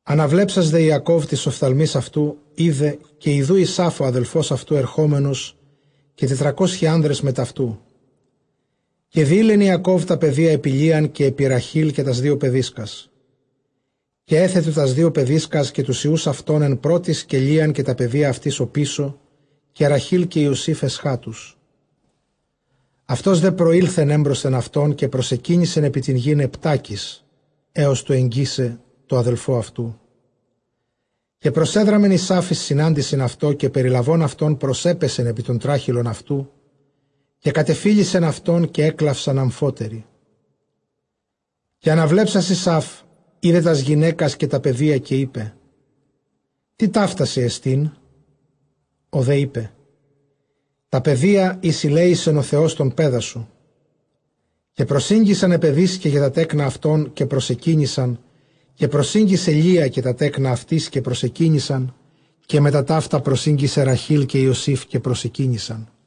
Ἀναβλέψας δὲ Ἰακὼβ τοῖς ὀφθαλμοῖς αὐτοῦ εἶδε· καὶ ἰδοὺ Ἡσαῦ ὁ ἀδελφὸς αὐτοῦ ἐρχόμενος, καὶ τετρακόσιοι ἄνδρες μετʼ αὐτοῦ· καὶ διεῖλεν Ἰακὼβ τὰ παιδία ἐπὶ Λείαν, καὶ ἐπὶ Ῥαχὴλ, καὶ τὰς δύο παιδίσκας. Καὶ ἔθετο τὰς δύο παιδίσκας καὶ τοὺς υἱοὺς αὐτῶν ἐν πρώτοις, καὶ Λείαν καὶ τὰ παιδία αὐτῆς ὀπίσω, καὶ Ῥαχὴλ καὶ Ἰωσὴφ ἐσχάτους. Αὐτὸς δὲ προῆλθεν ἔμπροσθεν αὐτῶν· καὶ προσεκύνησεν ἐπὶ τὴν γῆν ἑπτάκις, ἕως τοῦ ἐγγίσαι τῷ ἀδελφῷ αὐτοῦ. Καὶ προσέδραμεν Ἡσαῦ εἰς συνάντησιν αὐτῷ· καὶ περιλαβὼν αὐτὸν προσέπεσεν ἐπὶ τὸν τράχηλον αὐτοῦ, καὶ κατεφίλησεν αὐτόν· καὶ ἔκλαυσαν ἀμφότεροι. Καὶ ἀναβλέψας Ἡσαῦ εἶδε τὰς γυναῖκας καὶ τὰ παιδία· καὶ εἶπε, τί ταῦτά σοι ἐστίν; ὁ δὲ εἶπε, τὰ παιδία, οἷς ἠλέησεν ὁ Θεὸς τὸν παῖδά σου. Καὶ προσήγγισαν αἱ παιδίσκαι καὶ τὰ τέκνα αὐτῶν, καὶ προσεκύνησαν. Καὶ προσήγγισε Λεία καὶ τὰ τέκνα αὐτῆς, καὶ προσεκύνησαν· καὶ μετὰ ταῦτα προσήγγισε Ῥαχὴλ καὶ Ἰωσὴφ, καὶ προσεκύνησαν.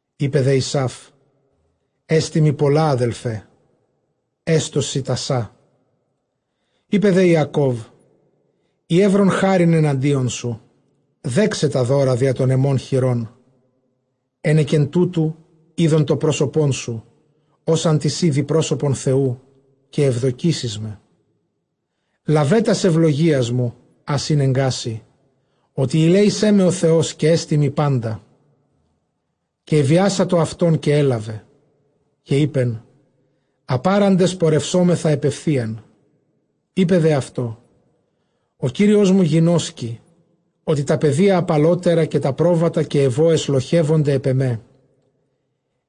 Εἶπε δὲ Ἡσαῦ, ἔστι μοι πολλὰ, ἀδελφέ· ἔστω σοι τὰ σά. Εἶπε δὲ Ἰακὼβ, εἰ εὓρον χάριν ἐναντίον σου, δέξαι τὰ δῶρα διὰ τῶν ἐμῶν χειρῶν· ἕνεκεν τούτου εἶδον τὸ πρόσωπόν σου, ὡς ἄν τις ἴδοι πρόσωπον Θεοῦ, καὶ εὐδοκήσεις με. Λάβε τὰς εὐλογίας μου, ἃς ἤνεγκά σοι, ὅτι ἠλέησέ με ὁ Θεὸς, καὶ ἔστι μοι πάντα· καὶ ἐβιάσατο αὐτὸν, καὶ ἔλαβε. Καὶ εἶπεν, ἀπάραντες πορευσώμεθα ἐπʼ εὐθεῖαν. Εἶπε δὲ αὐτῷ, ὁ κύριός μου γινώσκει, ὅτι τὰ παιδία ἁπαλώτερα, καὶ τὰ πρόβατα καὶ αἱ βόες λοχεύονται ἐπʼ ἐμέ·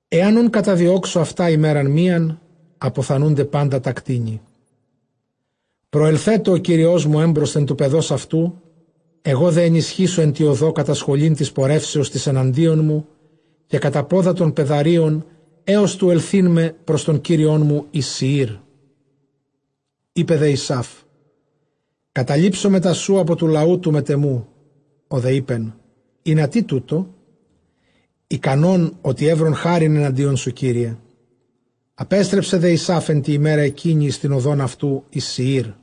ἐὰν οὖν καταδιώξω αὐτὰ ἡμέραν μίαν, ἀποθανοῦνται πάντα τὰ κτήνη. Προελθέτω ὁ κύριός μου ἔμπροσθεν τοῦ παιδὸς αὐτοῦ· ἐγὼ δὲ ἐνισχύσω ἐν τῇ ὁδῷ κατὰ σχολὴν τῆς πορεύσεως τῆς ἐναντίον μου, καὶ κατὰ πόδα τῶν παιδαρίων, ἕως τοῦ ἐλθεῖν με πρὸς τὸν κύριόν μου εἰς Σηείρ. Εἶπε δὲ Ἡσαῦ, καταλείψω μετὰ σοῦ ἀπὸ τοῦ λαοῦ τοῦ μετʼ ἐμοῦ· ὁ δὲ εἶπεν, ἱνατί τοῦτο; ἱκανὸν ὅτι εὗρον χάριν ἐναντίον σου, κύριε. Ἀπέστρεψε δὲ Ἡσαῦ ἐν τῇ ἡμέρᾳ ἐκείνῃ εἰς τὴν ὁδὸν αὐτοῦ εἰς Σηείρ.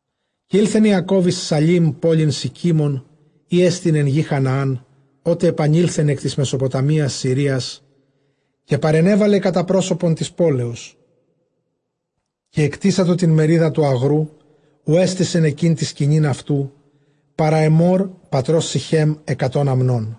Καὶ ἦλθεν Ἰακὼβ εἰς Σαλὴμ, πόλιν Σηκίμων, ἥ ἐστιν ἐν γῇ Χαναὰν, ὅτε ἐπανῆλθεν ἐκ τῆς Μεσοποταμίας Συρίας· καὶ παρενέλαβε κατὰ πρόσωπον τῆς πόλεως. Καὶ ἐκτήσατο τὴν μερίδα τοῦ ἀγροῦ, οὗ ἔστησεν ἐκεῖ τὴν σκηνὴν αὐτοῦ, παρὰ Ἐμμὼρ πατρὸς Συχὲμ, ἑκατὸν ἀμνῶν.